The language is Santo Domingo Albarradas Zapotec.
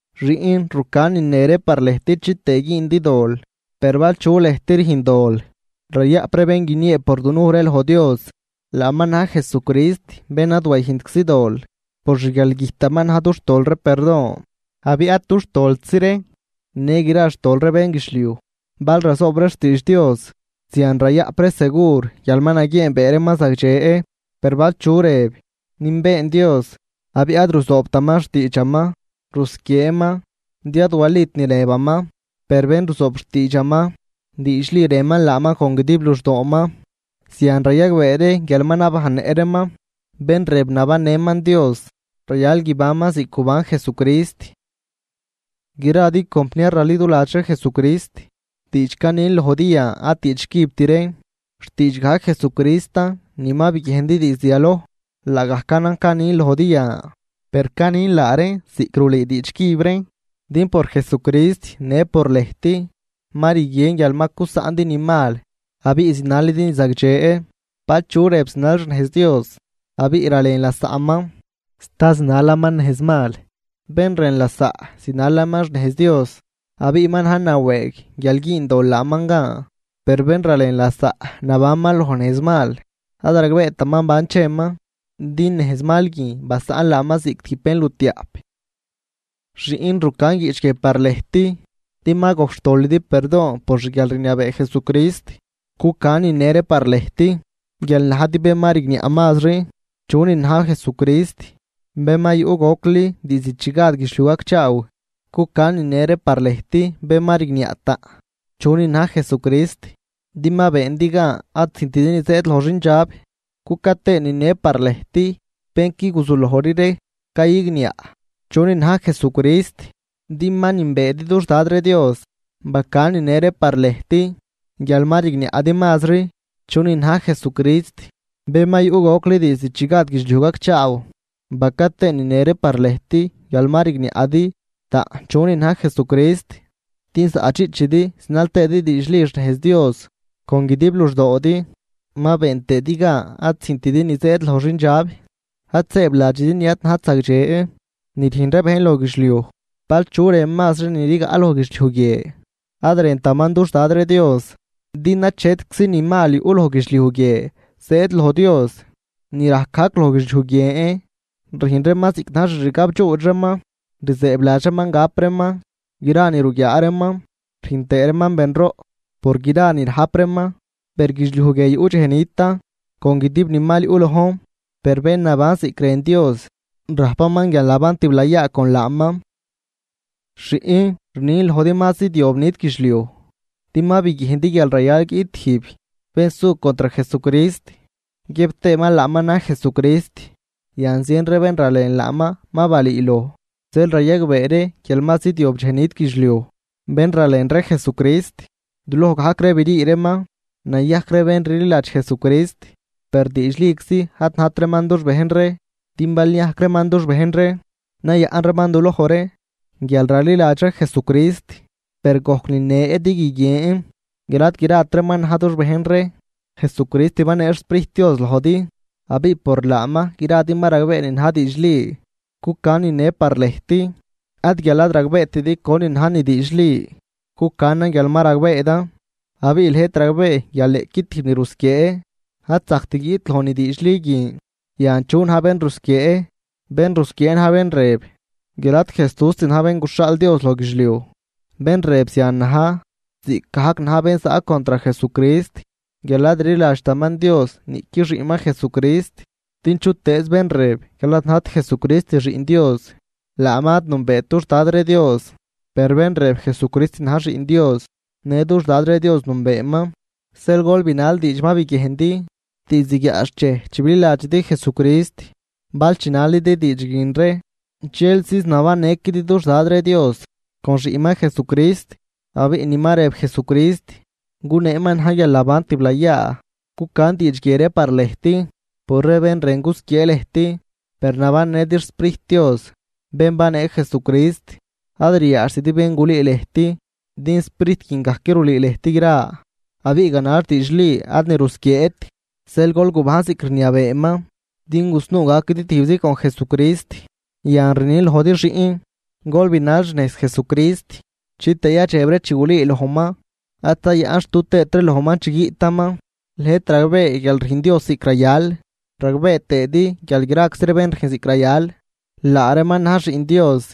Xiꞌn, rucan nine ree par lëjt chitëë güündi dol. Per bal chu lëjt rüjn dol, rayaꞌp ree bén guiniee por dunuj ree loj Dios, laaman na̱j Jesucrist bén ad wayüjntczi dol. Por xguialgüjtaman na̱j dux tol ree perdon, abiꞌ ad dux toltzi ree, në gra xtol ree bénguidxliuj. Bal razoob ree xtiidx Dios, zian rayaꞌp ree segur guial ma naguieenbee reeman zagdxe. Per bal chu rëb: “Nünbeen Dios”, abiꞌ ad ruzoobtaman xtiidxaman, rusquieeman, din ad walit ni rëbaman. Per bénruzoob xtiidxaman, diidxli rënman laaman con guidib luxdooman, zian rayagbee ree guial ma nabajnnëꞌ reeman. Bén rëb nabannëman Dios, rayal guibanman ziꞌc guban Jesucrist. Gradi compniar raliduladx ree Jesucrist, diidx canin lojdi yan ad diidx cübt reen, xtiidx gajc Jesucristan ni ma biguiejndi diizd yaloj, laagajcanan canin lojdi yan. Per canin laa reen ziꞌc rulüü diidx cüb reen, din por Jesucrist në por lëjt ma rguien guial ma cusaꞌndi ni mal abiꞌ zinalidi ni zagdxe. Bal chu rëb zinal xnejz Dios abiꞌ ralen lasaꞌman, sta zinalaman nejz mal. Bén rën lasaꞌ zinalaman xnejz Dios, abiꞌ ma na̱j nawëëg guial güün dol laaman gan. Per bén ralen lasaꞌ, nabanman loj nejz mal, ad ragbeetaman ban cheman, din nejz mal guin basaꞌn laaman ziꞌc tijb bénlutiaꞌp. Xiꞌn, rucan guiꞌch guie par lëjt, din ma gojc xtolidi perdon por xguialrniabee Jesucrist. Cucan nine ree par lëjt guial najdi bén ma rigniaꞌ mazri chunin na̱j Jesucrist. Bén ma yuꞌ gocli diizd chi gad guidxliuj gacchaaw, cucan ni ne ree par lëjt bén ma rigniaꞌ taꞌn chunin na̱j Jesucrist din ma beendi gan ad züjntidi ni zëëd loj xindxab, cuca tëën nine ree par lëjt bén qui guzulojri ree cayigniaꞌ chunin na̱j Jesucrist din ma nünbeedi dux Dad ree Dios. Bacan nine ree par lëjt guial ma rigniaꞌdi mazri chunin na̱j Jesucrist bén ma yuꞌ gocli diizd chi gad guidxliuj gacchaaw, baca tëën nine ree par lëjt guial ma rigniaꞌdi taꞌn chunin na̱j Jesucrist, din zaꞌdxiꞌchidi zinal tëëdi diidxli xnejz Dios con guidib luxdoodi, ma been tëëdi gan ad züjntidi ni zëëd loj xindxab. Ad sëëbladxidi ni ad najt zagdxe ni rüjn ree bejn loj guidxliuj, bal chu rën mazri ni rigaꞌ loj guidxliuj guie, ad rëntaman dux Dad ree Dios, din achetczi ni mal yuꞌ loj guidxliuj guie zëëd loj Dios, ni rajc gajc loj guidxliuj guien, rüjn reeman ziꞌc na̱j xixgab dxuudx reeman, rzëëbladx reeman gap reeman gra ni ruguiaa reeman, rüjn tëë reeman benroꞌ por gra ni rajp reeman. Per guidxliuj guie yuꞌ dxej nitan con guidib ni mal yuꞌ lojn, per bén naban ziꞌc rën Dios rajpaman guialnaban tiblayaa con laaman. Xiꞌn, rnin lojdi ma zidyob dxej nit guidxliuj, din ma biguiejndi guial rayal guiꞌt tijb bén su contr Jesucrist guiëb tëëman laaman na̱j Jesucrist. Yan zien ree bén ralen laaman ma balüüloj, zeel rayagbee ree guial ma zidyob dxej nit guidxliuj. Bén ralen ree Jesucrist, duloj gajc ree brii reeman nayajc ree bén rliladx Jesucrist, per diidxliczi ad najt reeman dux bejn ree, din bal niajc reeman dux bejn ree, nayaꞌn reeman duloj ree guial raliladx ree Jesucrist, per gojc nine din guiguien guial ad grat reeman na̱j dux bejn ree. Jesucrist banee xSprijt Dios lojdi, abiꞌ por laaman gradi ma ragbee ni na̱j diidxli. Cucan nine par lëjt, ad guial ad ragbeetidi conin na̱j ni diidxli, cucanan guial ma ragbeedan, abiꞌ lëjt ragbee guial niꞌqui tijb ni rusquiee ad zajct guiꞌt loj ni diidxli guin. Yan, ¿chu na̱j bén rusquiee? Bén rusquiee na̱j bén rëb guial ad Jesúst na̱j bén guxhaal Dios loj guidxliuj. Bén rëb zian na̱j ziꞌcgajc na̱j bén zaꞌ contr Jesucrist guial ad rliladxtaman Dios niꞌqui xiꞌnman Jesucrist. Din chutëëz bén rëb guial ad najt Jesucrist Xiꞌn Dios, laaman ad nünbeet dux Dad ree Dios, per bén rëb Jesucrist na̱j Xiꞌn Dios në dux Dad ree Dios nünbeeman. Zeel gol binal diidx ma biguiejndi diizd guiaꞌxchej chi bililadxidi Jesucrist. Bal chinalidi diidx guin ree, dxel ziz nabannëquidi dux Dad ree Dios con xiꞌnman Jesucrist. Abiꞌ ni ma rëb Jesucrist guneeman na̱j guialnaban tiblayaa. Cucan diidx guie ree par lëjt por ree bén rën gusquiee lëjt. Per nabannëdi xSprijt Dios, bén banee Jesucrist, ad riaadxtidi bén gulüü lëjt, din Sprijt guin gajc rulüü lëjt gra, abiꞌ ganax diidxli ad ni rusquieet, zeel gol gubajn ziꞌc rniabeeman din gusnuu gaquidi tijbzi con Jesucrist. Yan rnin lojdi xiꞌn, gol binal xnejz Jesucrist, chitëë yadxeb ree chi gulüülojman, ad zayaꞌnxtu tëët ree lojman chi guiꞌtaman. Lëjt ragbee guial rüjn Dios ziꞌc rayal, ragbee tëëdi guial graczi ree bén rüjn ziꞌc rayal, laa reeman na̱j xiꞌn Dios.